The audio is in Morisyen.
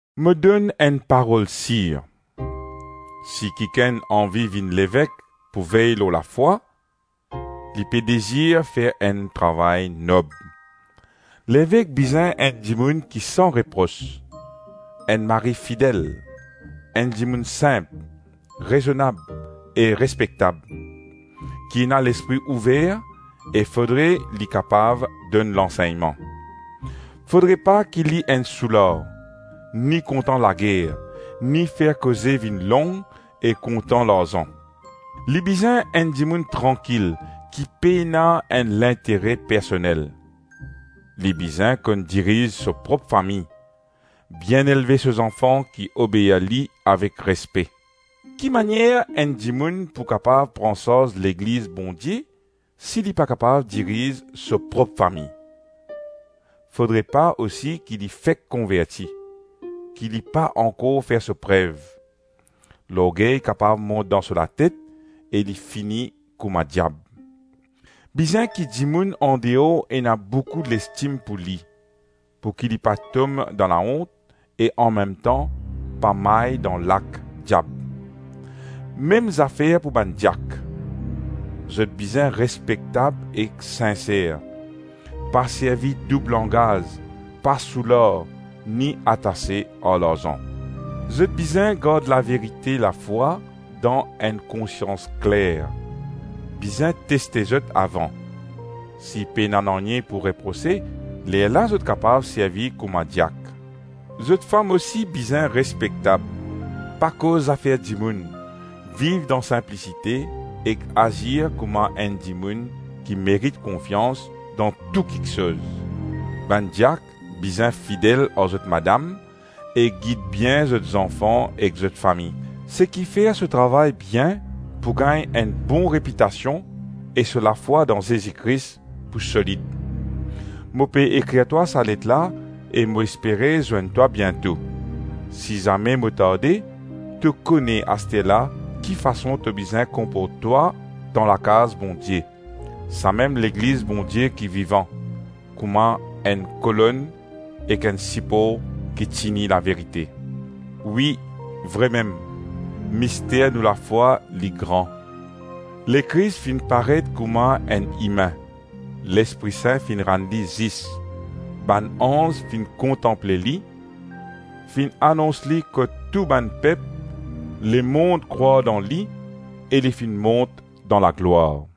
Mo donn enn parol sir: si kikenn anvi vinn levek pou vey lor lafwa, li pe dezir fer enn travay nob. Levek bizin enn dimoun ki san repros, enn mari fidel, enn dimoun sinp, rezonab e respektab, ki ena lespri ouver e fodre li kapav donn lansegnman. Fodre pa ki li enn soular, ni kontan lager, ni fer koze vinn long ek kontan larzan. Li bizin enn dimoun trankil ki pena enn lintere personel. Li bizin konn diriz so prop fami, bien elve so zanfan ki obeir li avek respe. Kimanier enn dimoun pou kapav pran sarz Legliz Bondie si li pa kapav diriz so prop fami? Fodre pa osi ki li fek konverti, ki li pa ankor fer so prev. Lorgey kapav mont dan so latet e li fini kouma diab. Bizin ki dimoun andeor ena boukou lestim pou li, pouki li pa tom dan laont e anmemtan pa may dan lak diab. Mem zafer pou bann diak. Zot bizin respektab ek sinser, pa servi doub langaz, pa soular, ni atase ar larzan. Zot bizin gard laverite lafwa dan enn konsians kler. Bizin teste zot avan. Si pena nanye pou reprose, lerla zot kapav servi kouma diak. Zot fam osi bizin respektab, pa koz zafer dimoun, viv dan sinplisite ek azir kouma enn dimoun ki merit konfians dan tou kiksoz. Bann diak bizin fidel ar zot madam e gid bien zot zanfan ek zot fami. Seki fer so travay bien pou gagn enn bon repitasion e so lafwa dan Zezi Kris pou solid. Mo pe ekrir twa sa let la, e mo espere zwenn twa biento. Si zame mo tarde, to kone asterla ki fason to bizin konport twa dan lakaz Bondie, samem Legliz Bondie ki vivan, kouma enn kolonn ek enn sipor ki tini laverite. Wi, vremem, mister nou lafwa, li gran. Lekris finn paret kouma enn imin, Lespri Sin finn rann li zis, Bann anz finn kontanple li, Finn anons li kot tou bann pep lemonn krwar dan li E li finn mont dan laglwar.